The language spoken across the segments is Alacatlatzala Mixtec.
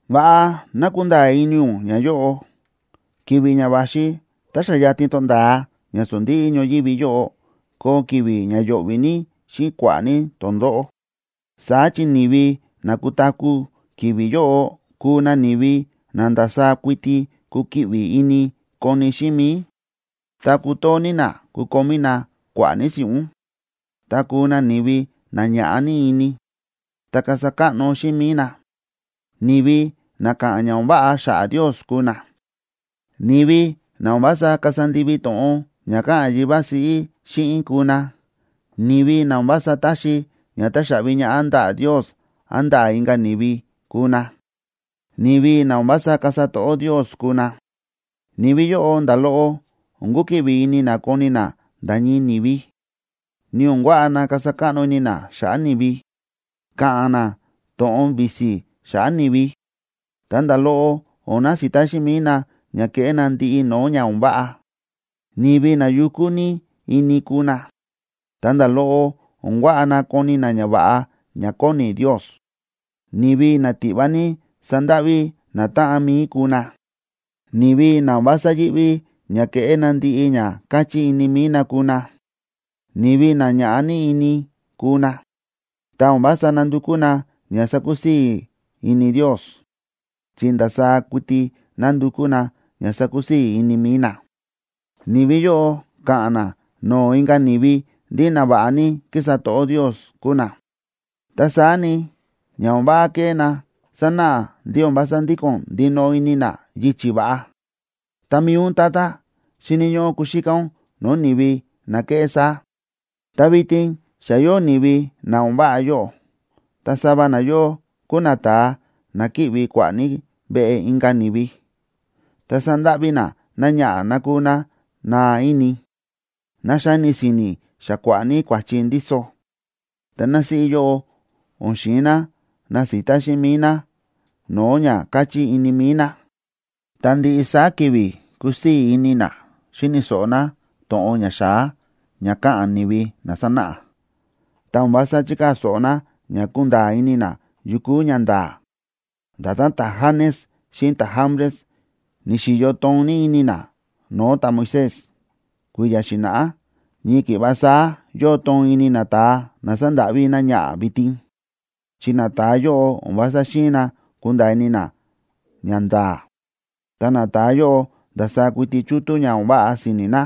Va̱ꞌa ná kunda̱a̱ ini ún ñayóꞌo: Ki̱vi̱ ña va̱xi tá xa yatin tonda̱a ña sondíꞌí ñoyívi yóꞌo koo ki̱vi̱ ña yo̱ꞌvi̱ ní xíꞌin kua̱ꞌa̱ ní tondóꞌó. Saá chi ni̱vi na kutaku̱ ki̱vi̱ yóꞌo kuu na ni̱vi na ndasaá kuiti kukiꞌvi ini koni xíꞌin mi̱i, ta kutoo ní na kukomí na kua̱ꞌa̱ ní si̱ꞌún, ta kuu na ni̱vi na ñaꞌá ní ini, ta kasa káꞌno xíꞌin mi̱i na. Ni̱vi na káꞌa̱n ña o̱n váꞌa xa̱ꞌa̱ Ndios kuu na, ni̱vi na o̱n vása kasa ndivi to̱ꞌon ña káꞌa̱n yivá siꞌí xíꞌin kuu na, ni̱vi na o̱n vása taxi ña táxaꞌvi ñaꞌá ndaꞌa̱ Ndios án ndaꞌa̱ inka̱ ni̱vi kuu na, ni̱vi na o̱n vása kasa to̱ꞌó Ndios kuu na. Ni̱vi yóꞌo nda̱ loꞌo o̱n kukiꞌvi ini na koni na nda̱ ñii ni̱vi, ni o̱n kuaꞌa na kasa káꞌno ini na xa̱ꞌa̱ ni̱vi. Ka̱ꞌa̱n na to̱ꞌon visi xa̱ꞌa̱ ni̱vi, ta nda̱ loꞌo o̱n nasita xíꞌin mi̱i na ña keꞌé na ndiꞌi no̱o̱ ña o̱n váꞌa. Ni̱vi na yukú ní ini kuu na, ta nda̱ loꞌo o̱n kuaꞌa na koni na ñava̱ꞌa ña kóni Ndios. Ni̱vi na tiꞌva ní sandáꞌví natáꞌan mi̱i kuu na, ni̱vi na o̱n vása yíꞌví ña keꞌé na ndiꞌi ña káchí ini mi̱i na kuu na. Ni̱vi na ña̱ꞌa ní ini kuu na, ta o̱n vása nandukú na ña sakusii̱ ini Ndios, chi ndasaá kuiti nandukú na ña sakusii̱ ini mi̱i na. Ni̱vi yóꞌo ka̱ꞌa̱n na no̱o̱ inka̱ ni̱vi ndí na va̱ꞌa ní kísa to̱ꞌó Ndios kúu na. Ta saá ni, ña o̱n váꞌa kéꞌé na sanáꞌa ndí o̱n vása ndíko̱n ndinoꞌo ini na yichi̱ va̱ꞌa. Ta mi̱i ún, tata, xíni̱ ñóꞌó kuxíká ún no̱o̱ ni̱vi na kéꞌé saá. Ta vitin xa yóo ni̱vi na o̱n váꞌa yóꞌo, ta sava nayóꞌo kúu nata̱a na kíꞌvi kua̱ꞌa̱ ní veꞌe inka̱ ni̱vi, ta sándáꞌví na náñaꞌa̱ ná kúu ná naa ini, ná xáni si̱ni̱ xa kua̱ꞌa̱ ní kua̱chi ndíso. Ta násíꞌí yóꞌo o̱n xi̱in ná nasita xíꞌin mi̱i ná no̱o̱ ña káchí ini mi̱i ná. Ta ndiꞌi saá ki̱vi̱ kúsii̱ ini ná xíni̱ so̱ꞌo ná to̱ꞌon ña xa̱á ña káꞌa̱n ni̱vi na sánáꞌa, ta o̱n vása chíkaa̱ so̱ꞌo ná ña kunda̱a̱ ini ná yu kúu ñanda̱a̱. Nda̱tán ta̱Janes xíꞌin ta̱Jambres, ni̱xi̱yo toon ní ini na no̱o̱ ta̱Moisés kui̱ya̱ xi̱na̱ꞌá, ñii ki̱ꞌva saá yóo toon ini nata̱a na sándáꞌví náñaꞌa̱ vitin, chi nata̱a yóꞌo o̱n vása xi̱in na kunda̱a̱ ini na ñanda̱a̱. Ta nata̱a yóꞌo ndasaá kuiti chútú ña o̱n váꞌa si̱ni̱ na,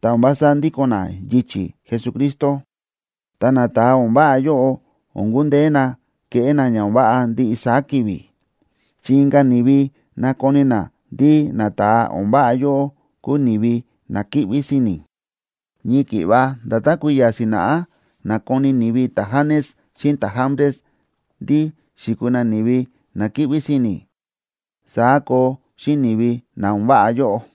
ta o̱n vása ndíko̱n na yichi̱ Jesucristo. Ta nata̱a o̱n váꞌa yóꞌo o̱n kundeé na keꞌé na ña o̱n váꞌa ndiꞌi saá ki̱vi̱, chi inka̱ ni̱vi nakoni na ndí nata̱a o̱n váꞌa yóꞌo kúu ni̱vi na kíꞌví si̱ni̱. Ñii ki̱ꞌva nda̱tán kui̱ya̱ xi̱na̱ꞌá na̱koni ni̱vi ta̱Janes xíꞌin ta̱Jambres ndí xi̱kuu na ni̱vi na kíꞌví si̱ni̱, saá koo xíꞌin ni̱vi na o̱n váꞌa yóꞌo.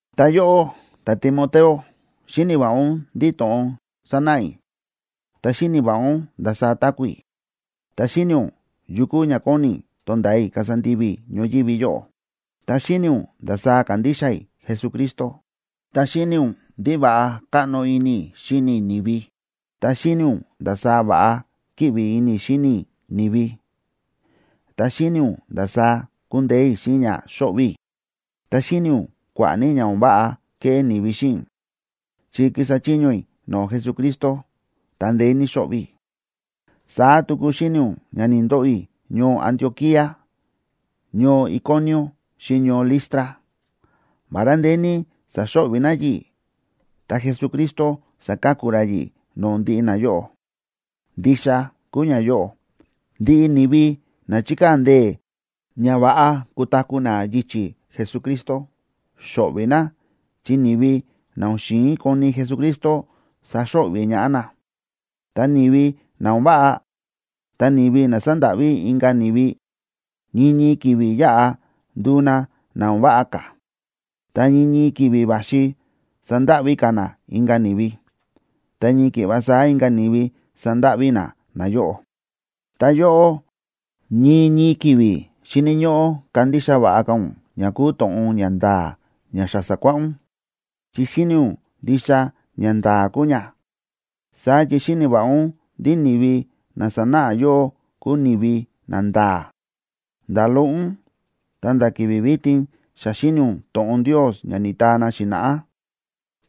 Ta yóꞌó, ta̱Timoteo, xíni̱ va̱ꞌa ún ndiꞌi to̱ꞌon sa̱náꞌa i̱, ta xíni̱ va̱ꞌa ún ndasaá táku̱ i̱, ta xíni̱ ún yu kúu ña kóni i̱ tonda̱a i̱ kasa ndivi i̱ ñoyívi yóꞌo, ta xíni̱ ún ndasaá kándixa i̱ Jesucristo, ta xíni̱ ún ndí va̱ꞌa káꞌno ini i̱ xíni i̱ ni̱vi, ta xíni̱ ún ndasaá va̱ꞌa kíꞌvi ini i̱ xíni i̱ ni̱vi, ta xíni̱ ún ndasaá kúndeé i̱ xíꞌin ña xóꞌvi̱ i̱. Ta xíni̱ ún kua̱ꞌa̱ ní ña o̱n váꞌa ke̱ꞌé ni̱vi xíꞌin i̱, chi kísa chiño i̱ no̱o̱ Jesucristo, ta ndeé ní xo̱ꞌvi̱ i̱. Saá tuku xíni̱ ún ña ni̱ndoꞌo i̱ ñoo Antioquía, ñoo Iconio xíꞌin ñoo Listra. Vará ndeé ní sa̱xo̱ꞌvi̱ na yi̱ꞌi̱, ta Jesucristo sa̱ka̱ku ra yi̱ꞌi̱ no̱o̱ ndiꞌi nayóꞌo. Ndixa kúu ñayóꞌo: Ndiꞌi ni̱vi na chíkaa̱ ndee̱ ña va̱ꞌa kutaku̱ na yichi̱ Jesucristo, xo̱ꞌvi̱ na chi ni̱vi na o̱n xi̱in koni Jesucristo saxo̱ꞌvi̱ ñaꞌá na. Ta ni̱vi na o̱n váꞌa, ta ni̱vi na sándáꞌví inka̱ ni̱vi, ñii ñii ki̱vi̱ yáꞌa nduu na na o̱n váꞌa ka̱, ta ñii ñii ki̱vi̱ va̱xi sandáꞌví ka̱ na inka̱ ni̱vi, ta ñii ki̱ꞌva saá inka̱ ni̱vi sandáꞌví na nayóꞌo. Ta yóꞌó, ñii ñii ki̱vi̱ xíni̱ ñóꞌó kandixa va̱ꞌa ka̱ ún ña kúu to̱ꞌon ña nda̱a̱ ña xa sa̱kuáꞌá ún, chi xíni̱ ún ndixa ñanda̱a̱ kúu ña. Saá chi xíni̱ va̱ꞌa ún ndí ni̱vi na sa̱náꞌa yóꞌó kúu ni̱vi nanda̱a̱. Nda̱ loꞌo ún, ta̱nda̱ ki̱vi̱ vitin xa xíni̱ ún to̱ꞌon Ndios ña ni̱taa na xi̱na̱ꞌá.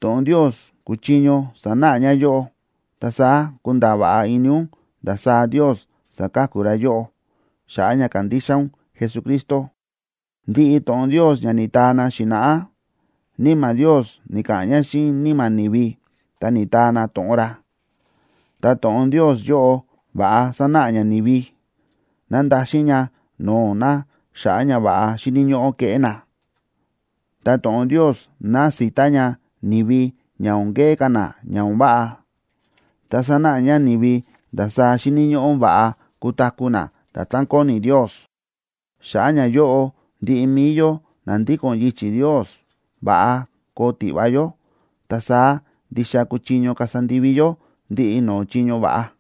To̱ꞌon Ndios kúchiño sanáꞌa ña yóꞌó, ta saá kunda̱a̱ va̱ꞌa ini ún ndasaá Ndios sáka̱ku ra yóꞌó xa̱ꞌa̱ ña kándixa ún Jesucristo. Ndiꞌi to̱ꞌon Ndios ña ni̱taa na xi̱na̱ꞌá, Níma̱ Ndios ni̱ka̱ꞌa̱n ña xíꞌin níma̱ ni̱vi, ta ni̱taa na to̱ꞌon ra. Ta to̱ꞌon Ndios yóꞌo va̱ꞌa sánáꞌa ña ni̱vi, nándaxin ña no̱o̱ na xa̱ꞌa̱ ñava̱ꞌa xíni̱ ñóꞌó keꞌé na, ta to̱ꞌon Ndios násita ña ni̱vi ña o̱n keꞌé ka̱ na ña o̱n váꞌa, ta sánáꞌa ña ni̱vi ndasaá xíni̱ ñóꞌó va̱ꞌa kutaku̱ na nda̱tán kóni Ndios. Xa̱ꞌa̱ ñayóꞌo ndiꞌi mi̱i yó na ndíko̱n yichi̱ Ndios va̱ꞌa koo tiꞌva yó, ta saá ndixa kuchiño kasa ndivi yó ndiꞌi no̱o̱ chiño va̱ꞌa.